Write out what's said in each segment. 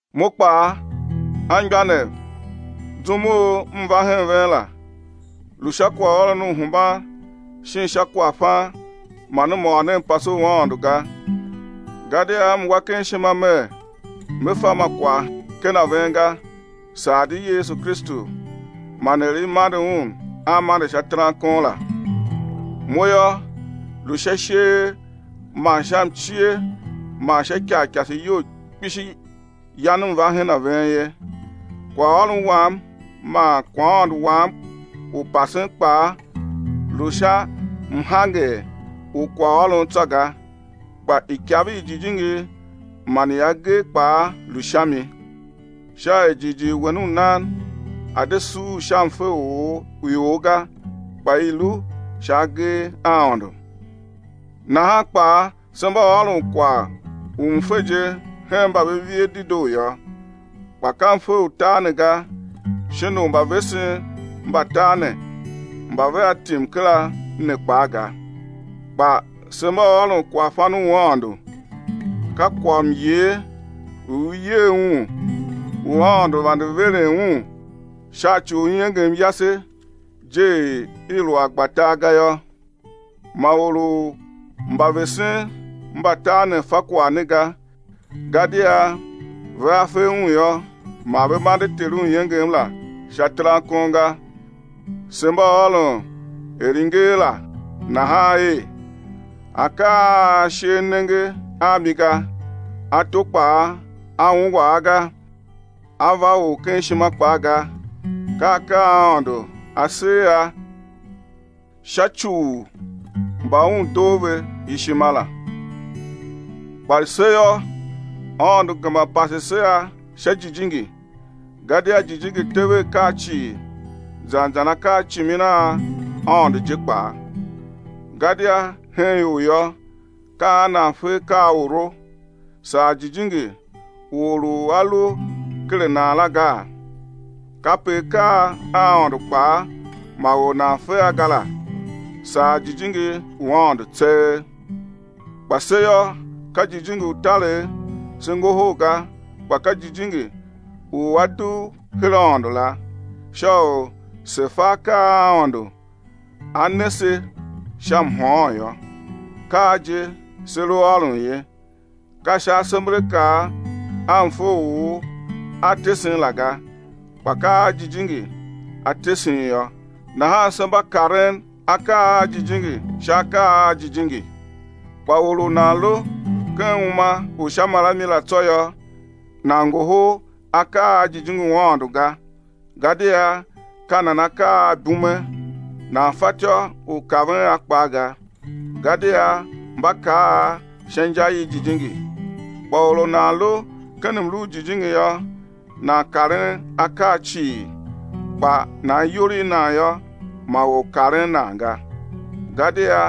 Mo kpaa, anmgbianev, zum u m va hen ven la, lu sha kwaghôron u hemban shin sha kwaghfan man m ôr ne mpase u Aôndo ga. Gadia m wa ken ishima mer me fa ma kwagh ken a ven ga, saa di Yesu Kristu man er i mande Un a mande sha terankon la. Mo yô, lu sha isheer man sha mcie man sha ikarikase iyol kpishi yan m va hen a ven ye. Kwaghôron wam man kwaghaôndo wam u pasen kpaa, lu sha mhanger u kwaghôron tsô ga, kpa ikav i Jijingi man i agee kpaa lu sha mi, sha er jighjigh wen u nan a̱ de suur sha mfe u ior ga, kpa i̱ lu sha agee a Aôndo. Nahan kpaa se mba ôron kwagh u mfe je hen mba ve vie dedoo yô, kpa ka mfe u tar ne ga shin u mbavesen mba tar ne mba vea tim kera ne kpaa ga. Kpa se mba ôron kwaghfan u Aôndo, ka kwaghmyer u i yer un, u Aôndo vande veren un sha ci u iengem yase je er i lu a gba tar ga yô. Ma or u mbavesen mba tar ne fa kwagh ne ga, gadia vea fe un yô, ma ve mande Ter u iengem la sha terankon ga. Se mba ôron er i nger la nahan er: Akaa a ashe a nenge a mi ga, ato kpaa a ungwa a ga, a ve or ken ishima kpaa ga, ka akaa a Aôndo A ser a sha ci u mba Un doo ve ishima la. Kpa se yô, Aôndo gema pase se a sha Jijingi. Gadia Jijingi tev akaa cii, zan zan akaacimin a Aôndo je kpaa. Gadia hen ior yô, ka an nan fe akaa a oro, saa jijingi u or u a lu ken a nan la gaa? Kape akaa a Aôndo kpaa ma or nan fe a ga la, saa Jijingi u Aôndo tseegh. Kpa se yô, ka jijingi u taregh se ngohol ga, kpa ka jijingi u A dugh her Aôndo la, sha u se̱ fa akaa a Aôndo A ne se sha mhôôn yô. Ka a je se lu ôron ye, ka sha asemberakaa a mfe u or a tesen la ga, kpa ka a Jijingi A tesen yô, nahan se mba karen akaa a jijingi sha akaa a jijingi. Kpa or u nan lu ken uma u sha marami la tsô yô, nan ngohol akaa a jijingi u Aôndo ga, gadia ka nan akaa a ibume, nan fatyô u kaven a kpaa ga, gadia mba kar a sha inja i jijingi. Kpa or u nan lu ken mlu u jijingi yô, nan karen akaa cii, kpa nan iyol i nan yô, ma or karen nan ga. Gadia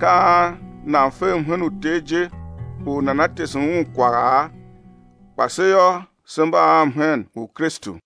ka an nan fe mhen u Ter je u nana tese Un kwagha? Kpa se yô, se mba a mhen u Kristu.